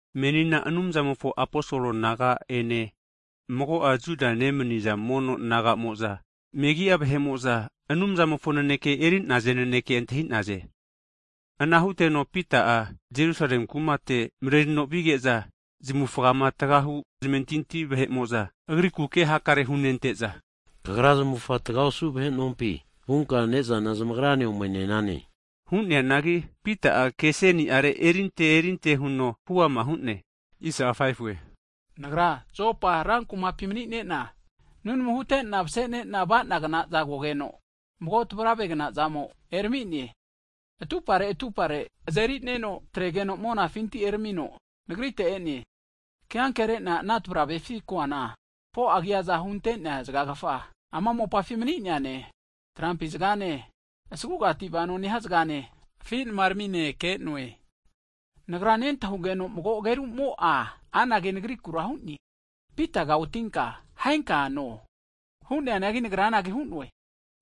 Menina Anumzamofo aposol naga ene mago'a Judia nemni'za mono naga'mo'za, megi'a vahe'mo'za (Gentiles) Anumzamofo naneke eri'naze nanekea antahi'naze. Ana huteno Pita'a Jerusale kumate mrerino vige'za, zamufama tgahu (circumcised) zamentinti vahe'mo'za agriku ke hakare hunente'za, kagra zamufa tga osu vahe nompi vunka ne'zana zamagrane omene'nane. Hu'neanagi Pita'a ke aseni'are erinte erinte huno huama hu'ne, Nagra Jopa ran (city) kumapi manine'na nunamu hute'na mase'nena ava'nagna'za kogeno, mago tavrave'gna zamo erami'ne, atupare atupare azeri'neno atregeno monafinti eramino nagrite e'ne. Keankere'na ana tavravefi koana, 4'a agiaza hunte'nea zgagfa ama mopafi mani'neane, trampi zgane asagugati vano nehia zgane afi' namaramine ke'noe. Nagra nentahugeno mago agerumo'a anage nagrikura hu'ne, Pitaga otinka, ahenka no hu'ne! Hu'neanagi nagra anage hu'noe,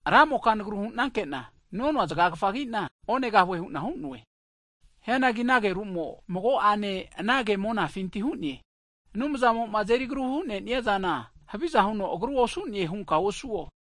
Ra'moka nagru hu'nanke'na nonoa zgagfagina onegahue hu'na hu'noe! Hianagi ana ageru'mo mago'ene anage monafinti hu'ne, Anumzamo'ma azeri agruma hu'neniazana, haviza huno agaru osu'ne hunka osuo!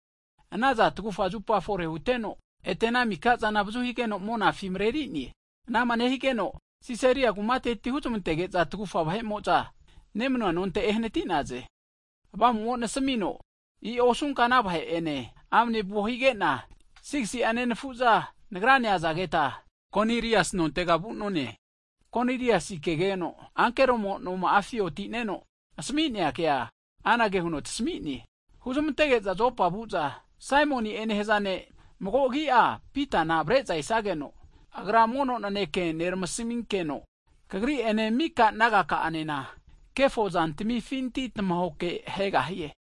Anazana tagufa (tri) zupa fore huteno, ete ana mika'zana avazu higeno monafi mareri'ne. Anama nehigeno, Sisaria kumateti huzmantege'za tagufa vahe'mo'za, nemanua nonte ehnati'naze. Avamumo nasamino i'o osunka ana vahe'ene amane vuo hige'na, 6si'a nenafu'za nagrane azageta Konilias nontega vu'none. Koniliasi kegeno ankeromo noma'afi oti'neno asami'nea kea, anage huno tasami'ne, huzamantege'za Jopa vu'za Saimoni'e nehaza ne', mago agi'a Pitana avare'za esageno, agra mono naneke neramasaminkeno, kagri'ene mika nagaka'anena, kefo zantmifinti tamahoke ahegahie.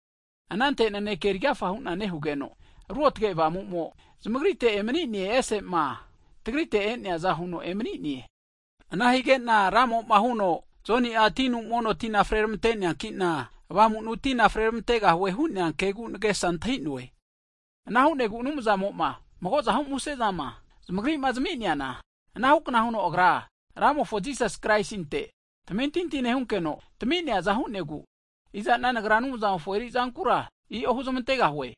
Anante naneke erigafa hu'na nehugeno, Ruotge Avamu'mo zamagrite erami'ne, ese'ma tagrite e'neaza huno emani'ne. Ana hige'na Ramo'ma huno, Joni'a tinu mono tina fre ramante'neankina, Avamunu tina frermantegahue hu'nea kegu nagesa antahi'noe. Ana hu'negu Anumzamo'ma magozahu muse'zama (gift) zamagri'ma zami'neana, anahu kna huno Agra Ramofo Jisasi Kraisinte tamentinti nehunkeno tami'neaza hu'negu, iza'na nagra Anumzamofo eri'zankura i'o huzamantegahue?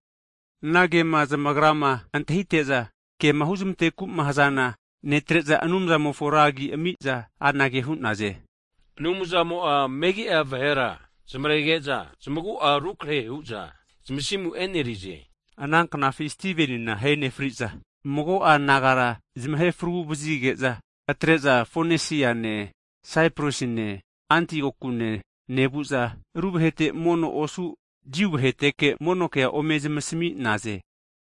Ana kema zamagrama antahite'za, kema huzmanteku'ma hazana netre'za, Anumzamofo ra agi ami'za anage hu'naze, Anumzamo'a megia vahera zamarege'za zamagu'a rukarehe hu'za zamasimu e'nerize hu'naze. Ananknafi Stivenina ahe nefri'za mago'a nagara zamahe fragu vazige'za, atre'za Fonesiane, Saiprasine, Antiokune, nevu'za ru vahete mono osu, Jiu vaheteke mono kea ome zamasmi'naze.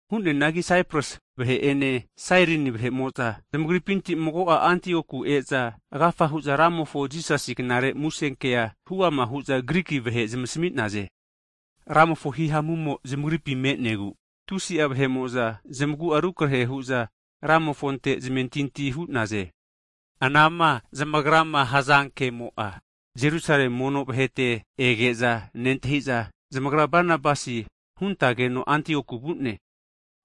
Hu'neanagi Saipras vahe'ene Sairini vahe'mo'za zamagripinti mago'a Antioku e'za, agafa hu'za Ramofo Jisasi knare musenkea huama hu'za Griki vahe zamasmi'naze. Ramofo hihamumo zamagripi me'negu, tusi'a vahe'mo'za zamagu'a rukarehe hu'za Ramofonte zamentinti hu'naze. Anama zamagrama hazankemo'a, Jerusale mono vahete ege'za nentahi'za, zamagra Banabasi huntageno Antioku vu'ne.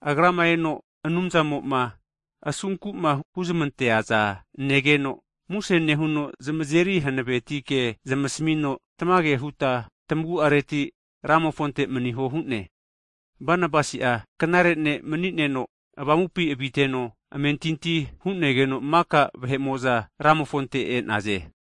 Agrama eno Anumzamo'ma asunku'ma humazmanteaza negeno, muse nehuno zamazeri hanaveti ke zamasmino, tamage huta tmaguareti Ramofonte maniho hu'ne. Banabasi'a knare ne' mani'neno, Avamupi aviteno amentinti hu'negeno, maka vahe'mo'za Ramofonte e'naze.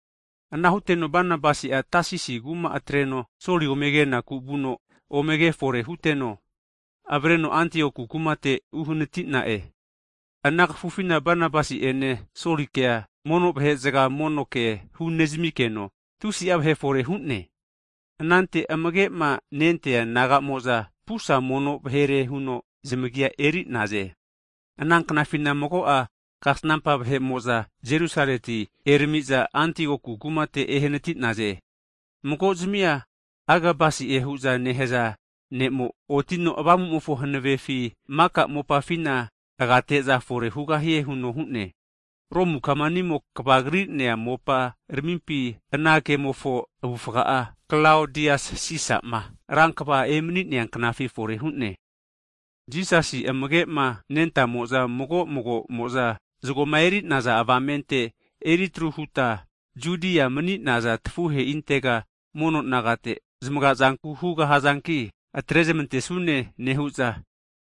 Ana huteno Banabasi'a Tasisi kuma atreno Soli omegenaku vuno, ome ke fore huteno avareno Antioku kumate uhanati'na'e. Ana kafufina Banabasi'ene Solikea mono vahe'zga mono kea hunezamikeno tusi'a vahe fore hu'ne. Anante amage'ma nentea disaipol naga'mo'za pusa (kristen) mono vahere huno zamagi'a eri'naze. Ana knafina mago'a kasnampa vahe'mo'za Jerusaleti erami'za, Antioku kumate ehanati'naze. Mago'zmia Agabasi'e hu'za nehaza ne'mo, otino Avamumofo hanavefi maka mopafina agate'za fore hugahie huno hu'ne. Romu kamanimo kva kri'nea mopa ramimpi, ana kemofo avufga'a (Klaodias Sisama ran kva emania knafi fore hu'ne). Jisasi amage'ma nentamo'za, mago mago'mo'za zagoma eri'naza avamente eritru huta Judia mani'naza tafuheintega (mono nagate) zamaga'zanku hugahazanki atre'zmantesune nehu'za,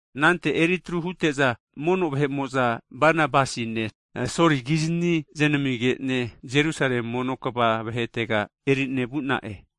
anante eri tru hute'za, mono vahe'mo'za, Banabasine Soli kizani znamige'ne, Jerusale mono kva vahetega eri'ne vu'na'e.